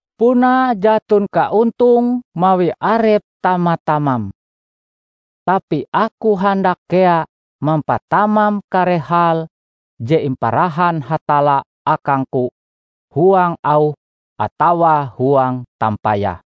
Puna jaton kaontonge mawi arep tama-tamam. Tapi aku handak kea mampatamam kare hal je imparahan Hatalla akangku huang auh atawa huang tampayah.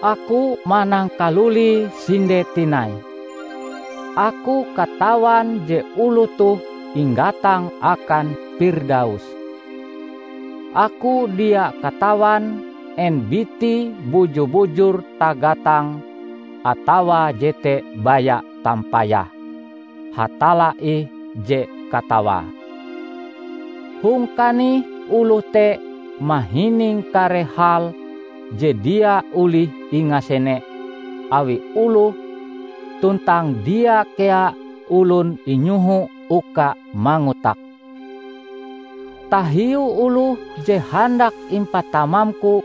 Aku manangkalulie sinde tinai: aku katawan je oloh toh inggatang akan Pirdaus. (Aku dia katawan en bitie buju-bujur tagatang atawa jete baya tampayah -- Hatalla ih je katawae.) Hong kanih oloh te mahining kare hal je dia olih ingasene awi oloh tuntang dia kea olon inyoho uka mangotake. Tahiu oloh je handak impatamamku,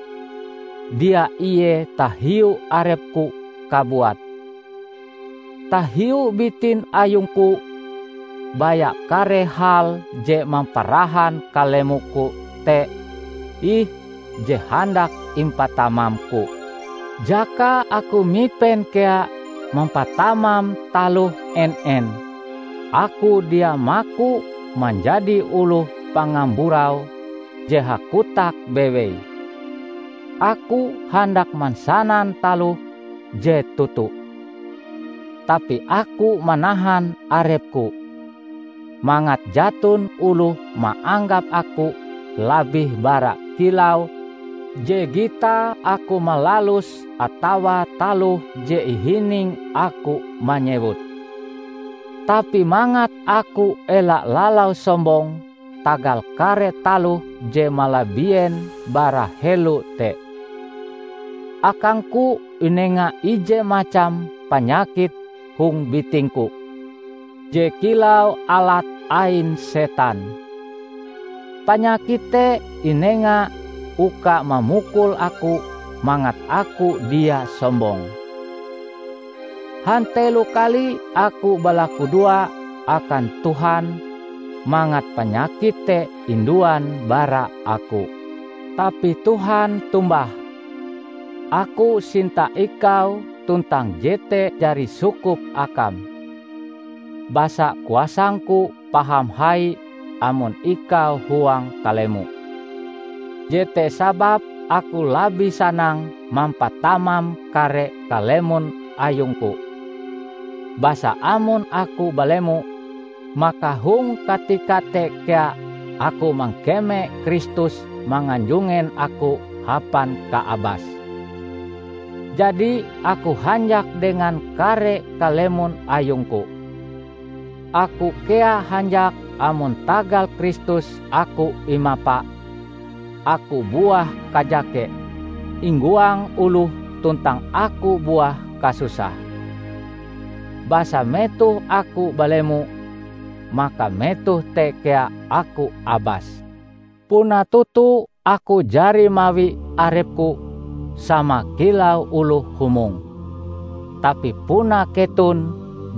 dia ie tahiu arepku kabuat. Tahiu bitin ayungku, baya kare hal je mamparahan kalemoku te ih je handak impatamamku. Jaka aku mipen kea mampatamam taloh en-en, aku dia maku manjadi oloh pangamburau je hakotak bewei; aku handak mansanan taloh je toto. Tapi aku manahan arepku, mangat jaton oloh maanggap aku labih bara kilau je gitae aku malaluse atawa taloh je ihininge aku manyewute. Tapi mangat aku ela lalau sombong tagal kare taloh je malabien bara helo te, akangku inenga ije macam panyakit hong bitingku je kilau alat ain setan. Panyakit te inenga uka mamukul aku mangat aku dia sombong. Hantelo kali aku balakudoa akan Tuhan mangat panyakit te induan bara aku. Tapi Tuhan tombah, "Aku sinta ikau tuntang jete jari sukup akam; basa kuasangku paham hai amon ikau huang kalemo." Jete sababe aku labih sanang mampatamam kare kalemon ayungku, basa amon aku balemo, maka hong katika te kea aku mangkeme Kristus manganjungen aku hapan kaabase. Jadi aku hanjak dengan kare kalemon ayungku. Aku kea hanjak amon tagal Kristus aku imapa, aku buah kajake, inggoang oloh tuntang aku buah kasusah. Basa metoh aku balemo, maka metoh te kea aku abas. Puna toto aku jari mawi arepku sama kilau oloh humong -- tapi puna keton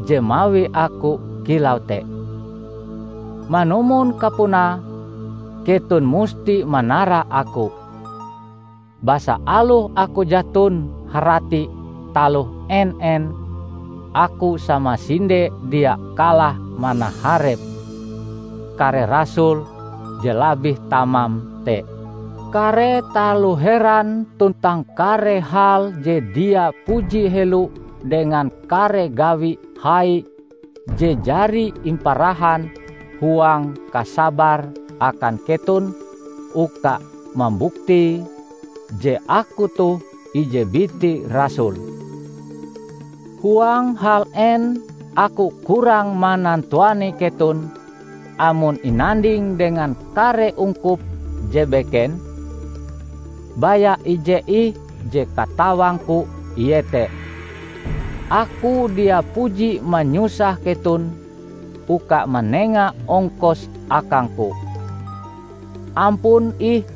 je mawi aku kilau te. Manumon kapunae, keton musti manara aku. Basa aloh aku jaton harati taloh en-en, aku samasinde dia kalah manaharep "kare rasul" je labih tamam te! Kare taloh heran tuntang kare hal je dia puji helo dengan kare gawi hai je jari imparahan huang kasabar akan keton uka mambuktie je aku toh ije biti rasul. Huang hal en aku kurang manantuani keton amon inanding dengan kare ungkup je beken? Baya ije ih je katawangku iete: aku dia puji manyusah keton uka manenga ongkos akangku. Ampun ih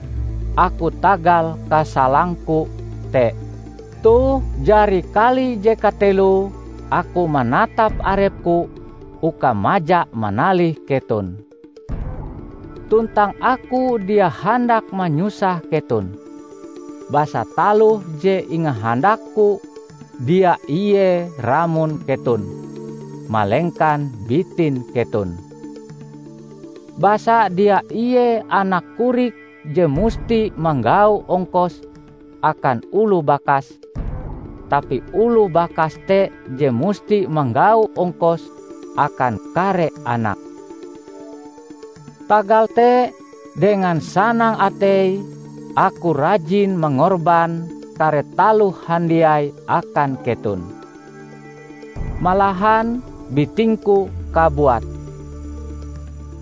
aku tagal kasalangku te! Toh jari kali je kateloe aku manatap arepku uka maja manalih keton. Tuntang aku dia handak manyusah keton, basa taloh je ingahandakku dia ie ramon keton, malengkan bitin keton. Basa dia ie anak korik je musti manggau ongkos akan oloh bakas, tapi oloh bakas te je musti manggau ongkos akan kare anake. Tagal te, dengan sanang atei aku rajin mangorban kare taloh handiai akan keton, malahan bitingku kabuat.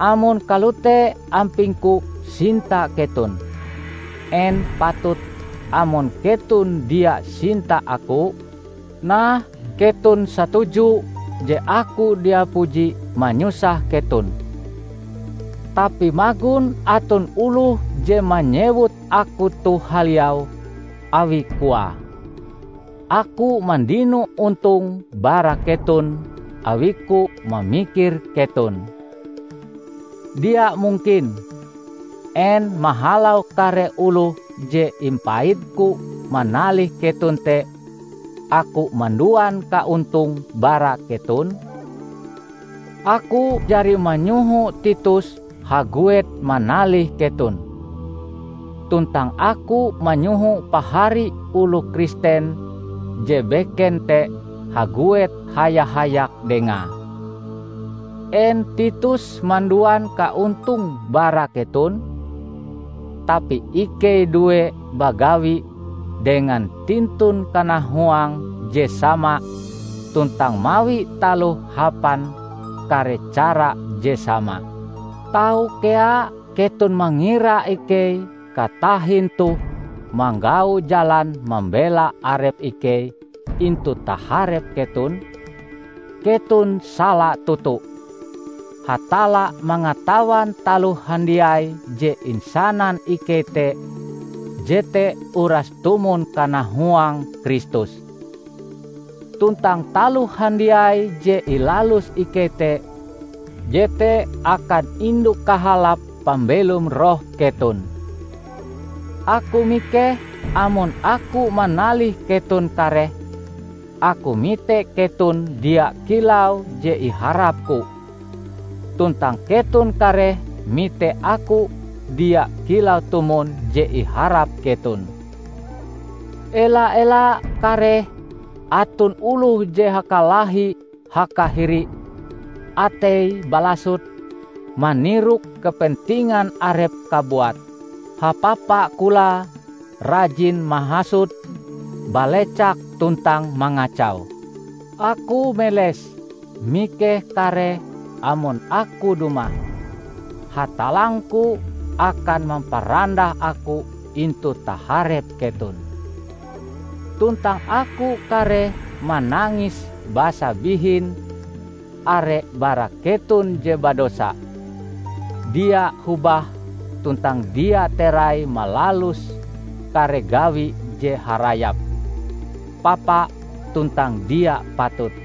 Amon kalote ampingku sinta keton, en patut amon keton dia sinta aku? Nah, keton satuju je aku dia puji manyusah keton. Tapi magon aton oloh je manyewut aku toh haliau; awi koae, aku mandino ontong bara keton awiku mamikir keton. Dia mungkin! En mahalau kare oloh je impaitku manalih keton te aku manduan kaontong bara keton? Aku jari manyoho Titus haguet manalih keton, tuntang aku manyoho pahari oloh Kristen je beken te haguet haya-hayak dengae. En Titus manduan kaontong bara keton? Tapi ikei due bagawi dengan tintun kanahuang je sama tuntang mawi taloh hapan kare cara je sama! Tau kea keton mangira ikei katahin toh manggau jalan mambela arep ikei intu taharep keton? Keton sala toto! Hatalla mangatawan taloh handiai je insanan ikei te jete uras tumon kanahuang Kristus. Tuntang taloh handiai je ilalus ikei te jete akan indu kahalap pambelom roh keton. Aku mikeh amon aku manalih keton kareh, aku mite keton dia kilau je iharapku, tuntang keton kareh mite aku dia kilau tumon je iharap keton. Ela-ela kareh aton oloh je hakalahi hakahiri, ateie balasut, manirok kepentingan arepe kabuat, hapapa kolae, rajin mahasut, balecak tuntang mangacau. Aku meles, mikeh kareh amon aku dumah, Hatallangku akan mamparandah aku intu taharep keton, tuntang aku kareh manangis basa bihin, are bara keton je badosa, dia hobah tuntang dia terai malalus kare gawi je harayap, papa tuntang dia patut.